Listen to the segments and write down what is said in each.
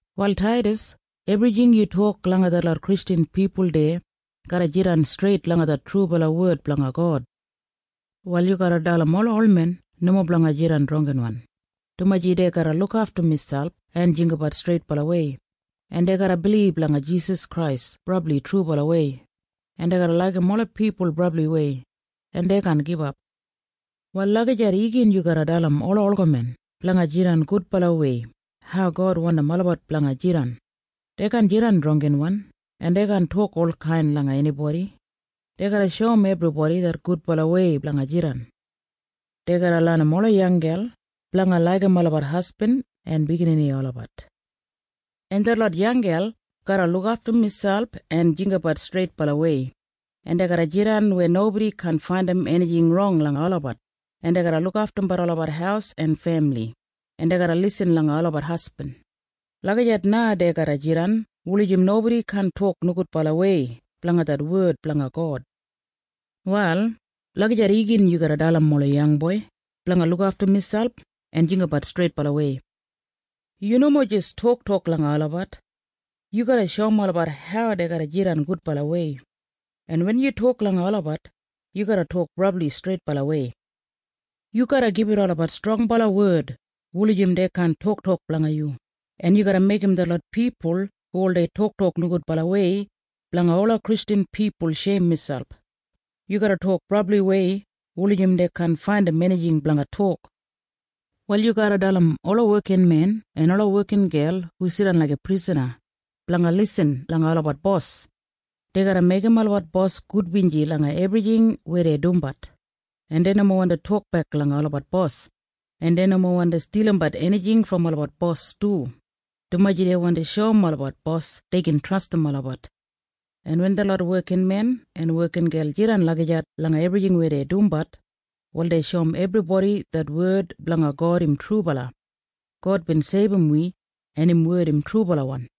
Wal Taidas, ebrijing yu tok langa detlot Kristjan pipul deya garra jidan streit langa det trubala wed blanga God. Wal yu garra dalim ola olmen nomo blanga jidan drangginwan, dumaji dei garra lukaftum miselp en jinggabat streitbalawei, en dei garra bilib langa Jisas Krais brabli trubalawei, en dei garra laigim ola pipul brabliwei, en dei kaan gibap. Wal lagijat gin yu garra dalim ola olgamen blanga jidan gudbalawei hau God wandim olabat blanga jidan. Dei kaan jidan drangginwan, en dei kaan tok olkain langa enibodi. Dei garra shoum ebribodi det gudbalawei blanga jidan. Dei garra lenim ola yanggel blanga laigim olabat hasbin en biginini olabat. En detlot yanggel garra lukaftum miselp en jinggabat streitbalawei, en dei garra jidan weya nobodi kaan faindim enijing rong langa olabat, en dei garra lukaftumbat olabat haus en femili, en dei garra lisin langa olabat hasbin. Lagijat na dei garra jidan wulijim nobodi kaan tok nogudbalawei blanga det wed blanga God. Wal lagijat igin yu garra dalim ola yangboi blanga lukaftum miselp en jinggabat streitbalawei. Yu nomo jis toktok langa olabat. Yu garra shoum olabat hau dei garra jidan gudbalawei. En wen yu tok langa olabat, yu garra tok brabli streitbalawei. Yu garra gibit olabat strongbala wed wulijim dei kaan toktok blanga yu, en yu garra meigim detlot pipul hu oldei toktok nogudbalawei blanga ola Kristjan pipul sheim miselp. Yu garra tok brabliwei wulijim dei kaan faindim enijing blanga tok. Wal yu garra dalim ola wekinmen en ola wekingel hu jidan laiga prisana, blanga lisin langa olabat bos. Dei garra meigim olabat bos gudbinji langa ebrijing weya dei dumbat, en dei nomo wandi tokbek langa olabat bos, en dei nomo wandi stilimbat enijing brom olabat bos du, dumaji dei wandi shoum olabat bos dei gin trastim olabat. En wen detlot wekinmen en wekingel jidan lagijat langa ebrijing weya dei dumbat, wal dei shoum ebribodi det wed blanga God im trubala. God bin seibum wi, en im wed im trubalawan.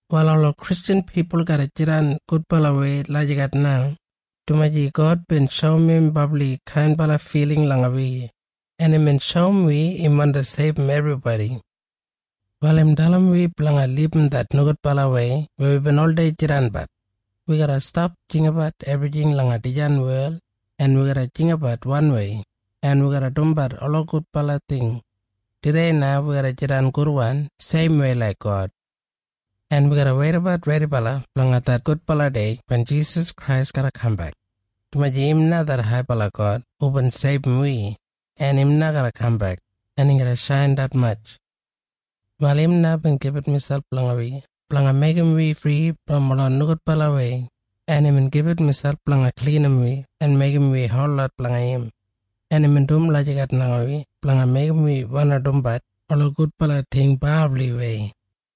Wal ola Kristjan pipul garra jidan gudbalawei lagijat na, dumaji God bin shoum im brabli kainbala filing langa wi, en imbin shoum wi im wandi seibum ebribodi. Wal im dalim wi blanga libum det nogudbalawei weya wibin oldei jidanbat. Wi garra stap jinggabat ebrijing langa dijan wel, en wi garra jinggabat wanwei, en wi garra dumbat ola gudbala ting. Tudei na wi garra jidan gudwan seimwei laik God. En wi garra weidabat redibala blanga det gudbala dei wen Jisas Krais garra kambek. Dumaji im na det haibala God hubin seibum wi, en im na garra kambek, en im garra shain detmatj. Wal im na bin gibit miselp blanga wi blanga meigim wi fri brom ola nogudbalawei, en imbin gibit miselp blanga klinim wi en meigim wi holot blanga im. En imbin dum lagijat langa wi blanga meigim wi wandi dumbat ola gudbala ting brabliwei.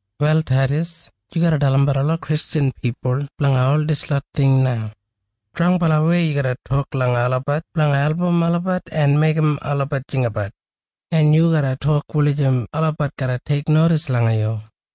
Wal Taidas, yu garra dalimbat ola Kristjan pipul blanga ol dislot ting na. Strongbalawei yu garra tok langa olabat blanga album olabat en meigim olabat jinggabat. En yu garra tok wulijim olabat garra teiknodis langa yu.